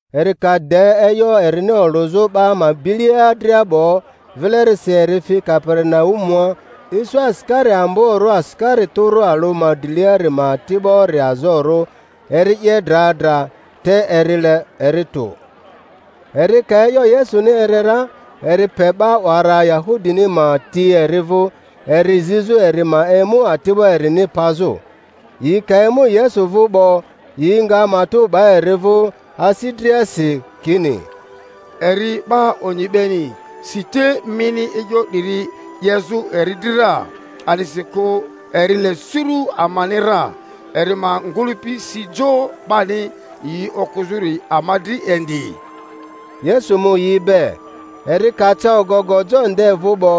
Eri ka de e'yo erini olᴜzᴜ 'ba ma bilia dria 'bo, vilerisi eri fi Kaperinaumua. Isu asikari amborᴜ asikari tᴜrᴜ alᴜ ma driliari ma ati'bori azorᴜ, eri 'ye dra dra, te eri le eri tᴜ. Eri ka e'yo Yesuni eri ra, eri pe 'ba 'wara Yahudini ma ti eri vᴜ, eri zizᴜ eri ma emu ati'bo erini pazᴜ. Yi ka emu Yesu vᴜ 'bo, yi nga matᴜ 'ba eri vᴜ asi driasi, kini, Eri 'ba onyi beni, si te mini e'yo 'diri 'yezᴜ eri dri ra, a'disikᴜ eri le suru amani ra, eri ma ngᴜlᴜpi si jo 'bani yi okᴜzᴜri ama dri indi. Yesu mu yi be. Eri ka ca ogogo jo nde vᴜ 'bo,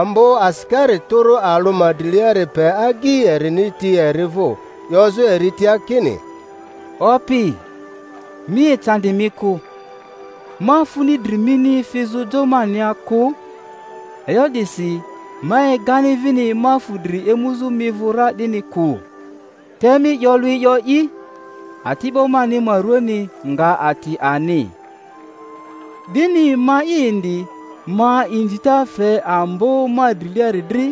ambo asikari tᴜrᴜ alᴜ ma driliari pe agyi erini ti eri vᴜ, 'yozᴜ eri tia kini, Opi, mi ecandi mi kᴜ, ma funi dri mini fizᴜ jo mania kᴜ; e'yo 'disi ma egani vini ma fu dri emuzᴜ mi vᴜ ra 'dini kᴜ. Te mi 'yo lᴜ e'yo'i, ati'bo mani ma ruani nga ati ani. 'Dini ma'i indi ma inzita fe ambo ma driliari dri,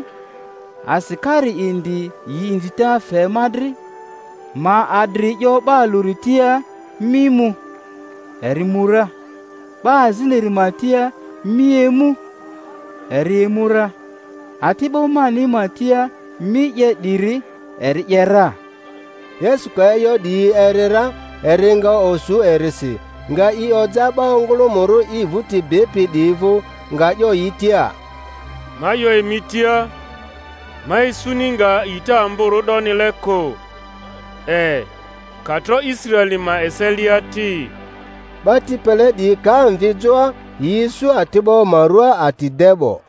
asikari indi yi inzita fe ma dri: ma adri 'yo 'ba alᴜri tia, Mi mu, eri mu ra; 'ba aziniri ma tia, Mi emu, eri emu ra; ati'bo mani ma tia, Mi 'ye 'diri, eri 'ye ra. Yesu ka e'yo 'diyi eri ra, eri nga osu erisi, nga i oja 'ba ongᴜlᴜmᴜrᴜ i vᴜti bipi 'diyi vᴜ, nga 'yo yi tia, Ma 'yo emi tia, ma isuni nga a'ita amborᴜ 'donile kᴜ, e, ka tro Israeli ma eselia ti. 'Ba ti pele 'diyi ka mvi joa, yi isu ati'bo ma rua ati de 'bo.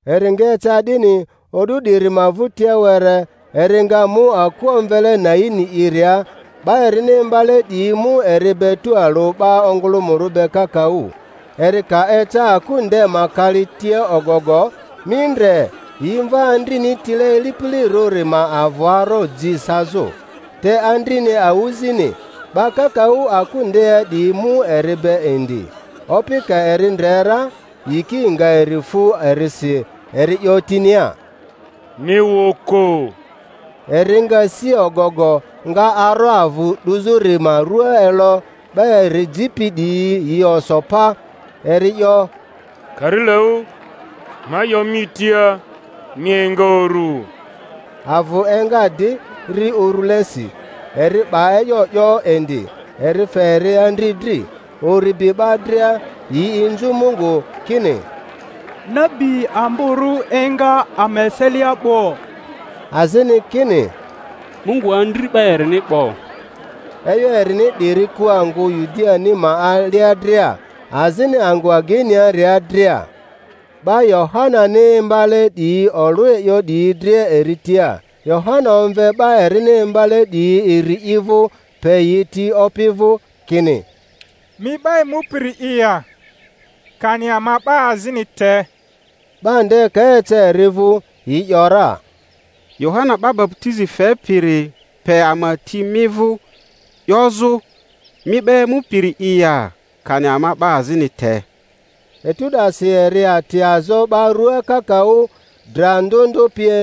Eri nga eca 'dini, o'du 'diri ma vᴜtia were, eri nga mu aku omvele Naini'iria; 'ba erini imbale 'diyi mu eri be tualᴜ 'ba ongᴜlᴜmᴜrᴜ be kakaᴜ. Eri ka eca aku nde ma kali tia ogogo, mi ndre, yi mva andrini tile ilipilirᴜri ma avᴜ aro ji sazᴜ, te andrini awᴜzini; 'ba kakaᴜ aku ndea 'diyi mu eri be indi. Opi ka eri ndre ra, yiki nga eri fu erisi, eri 'yo tinia, Mi wᴜ kᴜ. Eri nga si ogogo, nga aro avᴜ 'duzᴜri ma rua elo; 'ba eri jipi 'diyi yi oso pa. Eri 'yo, Karilaᴜ, ma 'yo mi tia, mi enga uru. Avᴜ enga di, ri urulesi, eri 'ba e'yo 'yo indi. Eri fe eri andri dri. Uri bi 'ba dria, yi inzu Mungu kini, Nabi amborᴜ enga ama eselia 'bo! azini kini, Mungu andri 'ba erini 'bo! E'yo erini 'diri ku angᴜ Yudiani ma alia dria, azini angᴜ ageiniaria dria. 'Ba Yohanani imbale 'diyi olᴜ e'yo 'diyi dria eri tia. Yohana omve 'ba erini imbale 'diyi iri i vᴜ, pe yi ti Opi vᴜ, kini, Mi 'ba emupiri'i ya, kani ama 'ba azini te? 'Ba nde ka eca eri vᴜ, yi ‘yora, Yohana 'ba baputizi fepiri pe ama ti mi vᴜ, 'yozᴜ, Mi 'ba emupiri'i ya, kani ama 'ba azini.te? Etu 'dasi eri ati azo 'ba ruaa kakaᴜ, dra ndᴜ ndᴜ pie,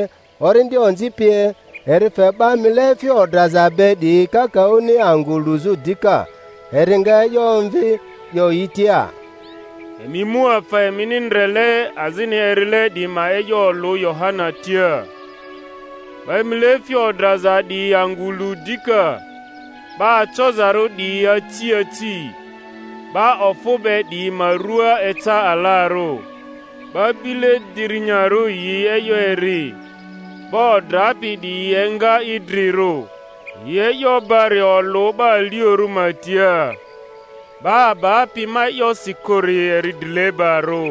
orindi onzi pie, eri fe 'ba mileefi odraza be 'diyi kakaᴜni angᴜ luzᴜ dika. Eri nga e'yo omvi, 'yo yi tia, Emi mu afa emini ndrele azini erile 'diyi ma e'yo olᴜ Yohana tia: 'ba mileefi odraza 'diyi angᴜ lu dika, 'ba acozarᴜ 'diyi aci aci, 'ba ofᴜ be 'diyi ma rua eca alarᴜ, 'ba bile dirinyarᴜ yi e'yo eri, 'ba odrapi 'diyi enga idrirᴜ, yi e'yo bari olᴜ 'ba aliorᴜ ma tia. 'Ba abapi ma e'yosi kᴜri eri drilebarᴜ.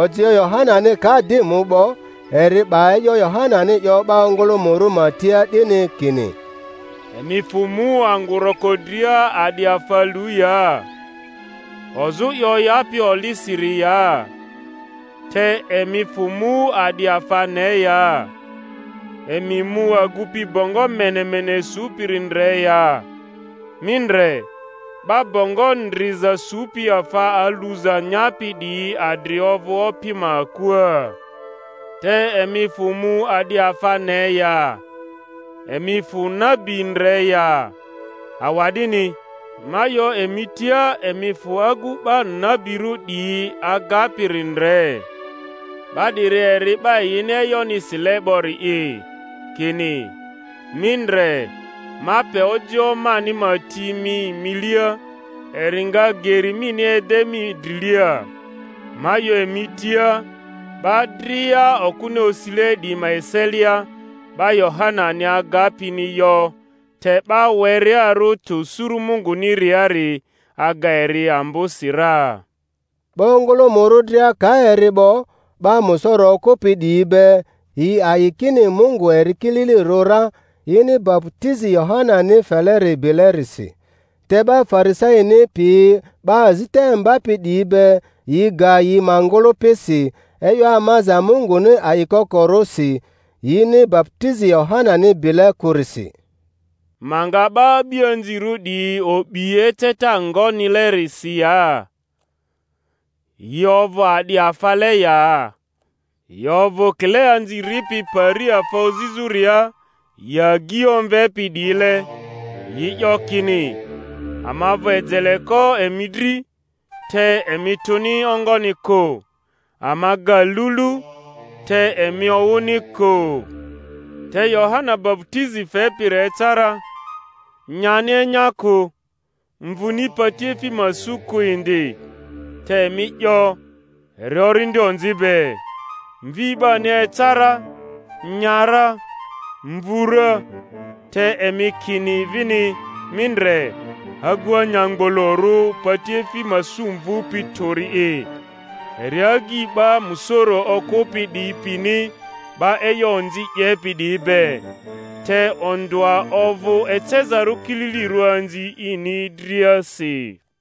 Ojioᴜ Yohanani ka di mu 'bo, eri 'ba e'yo Yohanani 'yo 'ba ongᴜlᴜmᴜrᴜ ma tia 'dini kini: Emi fᴜ mu angᴜ roko dria a'di afa lu ya? Ozᴜ i oyapi olisiri ya? Te emi fᴜ mu a'di afa ne ya? Emi mu agupi bongo menemene supiri ndre ya? Mi ndre, 'ba bongo ndriza supi afa aluza nyapi 'diyi adri ovᴜ opi ma akua. Te emi fᴜ mu a'di afa ne ya? Emi fᴜ nabi ndre ya? Awa'dini, ma 'yo emi tia, emi fᴜ agu 'ba nabirᴜ 'diyi agapiri ndre. 'Ba 'diri eri 'ba yini e'yoni sile 'bori'i, kini, Mi ndre, ma pe ojioᴜ mani ma ti mi milia, eri nga geri mini ede mi drilia. Ma 'yo emi tia, 'ba dria okᴜni osile 'diyi ma eselia, 'ba Yohanani agapini yo; te 'ba werearᴜ tᴜ suru Munguniari aga eri ambosi ra. 'Ba ongᴜlᴜmᴜrᴜ dria ka eri 'bo, 'ba musoro okᴜpi 'diyi be, yi a'i kini Mungu eri kililirᴜ ra, yini baputizi Yohanani feleri bilerisi. Te 'ba Farisaini piyi 'ba azita imbapi 'diyi be, yi ga yi ma ngᴜlᴜpisi e'yo amaza Munguni a'ikokorᴜ si, yini baputizi Yohanani bile kᴜrisi. Ma nga 'ba a'bianzirᴜ 'diyi o'bi eceta ngonilesi ya? Yi ovᴜ a'di afale ya? Yi ovᴜ kile anzi ripi pari afa ozizᴜria yi agyi omvepi 'diyile, yi 'yo kini, Ama vᴜ ejeleko emi dri, te emi tᴜni ongoni kᴜ; ama ga lulu, te emi owᴜni kᴜ. Te Yohana baputizi fepiri eca ra, nyani enya kᴜ, mvuni patiefi ma su kᴜ indi; te emi 'yo, Eri orindi onzi be. Mvi 'bani eca ra, nya ra, mvu ra; te emi kini vini, Mi ndre, agu anyamgbolorᴜ patiefi ma sᴜ mvupi tᴜri'i, eri agyi 'ba musoro okᴜpi 'diyi pini 'ba e'yo onzi 'yepi 'diyi be! Te ondᴜa ovᴜ ecezarᴜ kililirᴜ anzi ini driasi.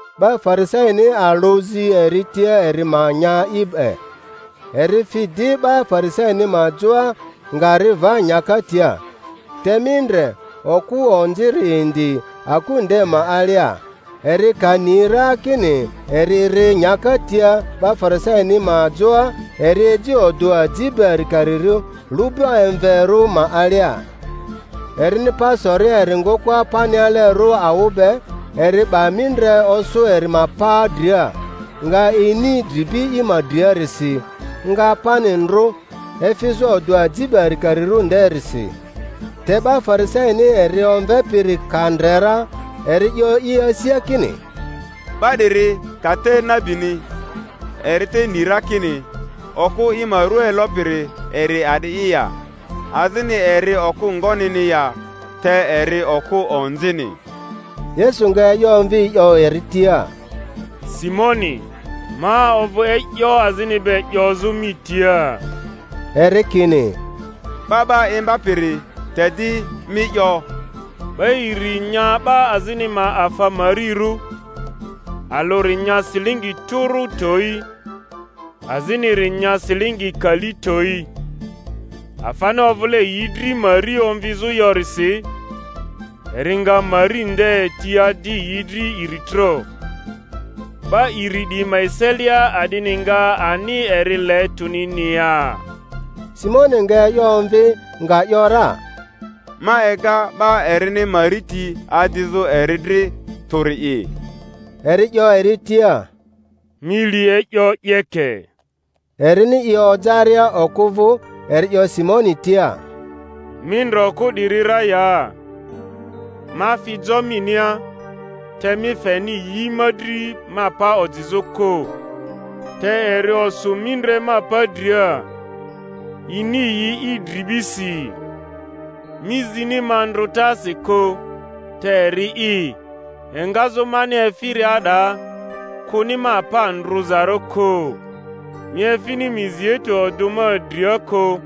'Ba Farisaini alᴜ zi eri tia eri ma nya i be. Eri fi di 'ba Farisaini ma joa, nga ri va nyaka tia. Te mi ndre, okᴜ onziri indi aku nde ma alia; eri ka ni ra kini eri ri nyaka tia 'ba Farisaini ma joa, eri eji odᴜ aji be arikarirᴜ lu'bu emverᴜ ma alia, erini pa soria eri ngᴜkᴜa panialerᴜ awᴜ be, eri 'ba mindre osᴜ eri ma pa dria, nga ini dribi i ma driarisi, nga pani ndrᴜ, efizᴜ odᴜ aji be arikarirᴜ nderisi. Te 'ba Farisaini eri omvepiri ka ndre ra, eri 'yo i asia kini, 'Ba 'diri ka te nabini, eri te ni ra kini okᴜ i ma rua elopiri eri a'di'i ya, azini eri okᴜ ngonini ya, te eri okᴜ onzini. Yesu nga e'yo omvi 'yo eri tia, Simoni, ma ovᴜ e'yo azini be 'yozᴜ mi tia. Eri kini, 'Ba 'ba Imbapiri, te di mi 'yo. 'Ba iri nya 'ba azini ma afa marirᴜ; alᴜri nya silingi tᴜrᴜ towi, aziniri nya silingi kali towi. Afani ovᴜle yi dri mari omvizᴜ yorisi, eri nga mari nde ti adi yi dri iri tro. 'Ba iri 'diyi ma eselia a'dini nga ani eri le tᴜnini ya? Simoni nga e'yo omvi, nga ‘yora, Ma ega 'ba erini mari ti adizᴜ eri dri tᴜri'i. Eri 'yo eri tia, Mi li e'yo 'yeke. Erini i ojaria okᴜ vᴜ, eri 'yo Simoni tia, Mi ndre okᴜ 'diri ra ya? Ma fi jo minia, te mi feni yi ma dri ma pa ojizᴜ kᴜ, te eri osᴜ mindre ma pa dria, ini yi i dribisi. Mi zini ma ndrᴜtasi kᴜ, te eri'i, engazᴜ mani efiria 'daa, kᴜni ma pa ndrᴜzarᴜ kᴜ. Mi efini mizeitu odᴜ ma dria kᴜ,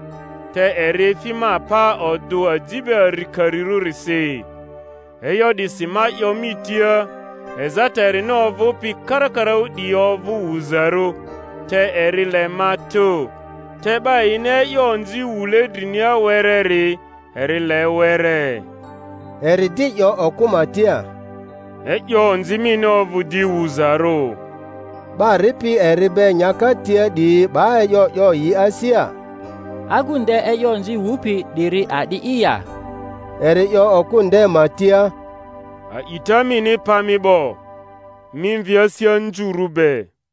te eri efi ma pa odᴜ aji be arikarirᴜrisi. E'yo 'disi ma 'yo mi tia, ezata erini ovᴜpi karakaraᴜ 'diyi ovᴜ wuzarᴜ, te eri le ma tᴜ; te 'ba yini e'yo onzi wule drinia wereri, eri le were. Eri di 'yo okᴜ ma tia, E'yo onzi mini ovᴜ di wuzarᴜ. 'Ba ripi eri be nyaka tia 'diyi 'ba e'yo 'yo yi asia, Agu nde e'yo onzi wupi 'diri a'di'i ya? Eri 'yo okᴜ nde ma tia, A'ita mini pa mi 'bo; mi mvi asi anzurᴜ be.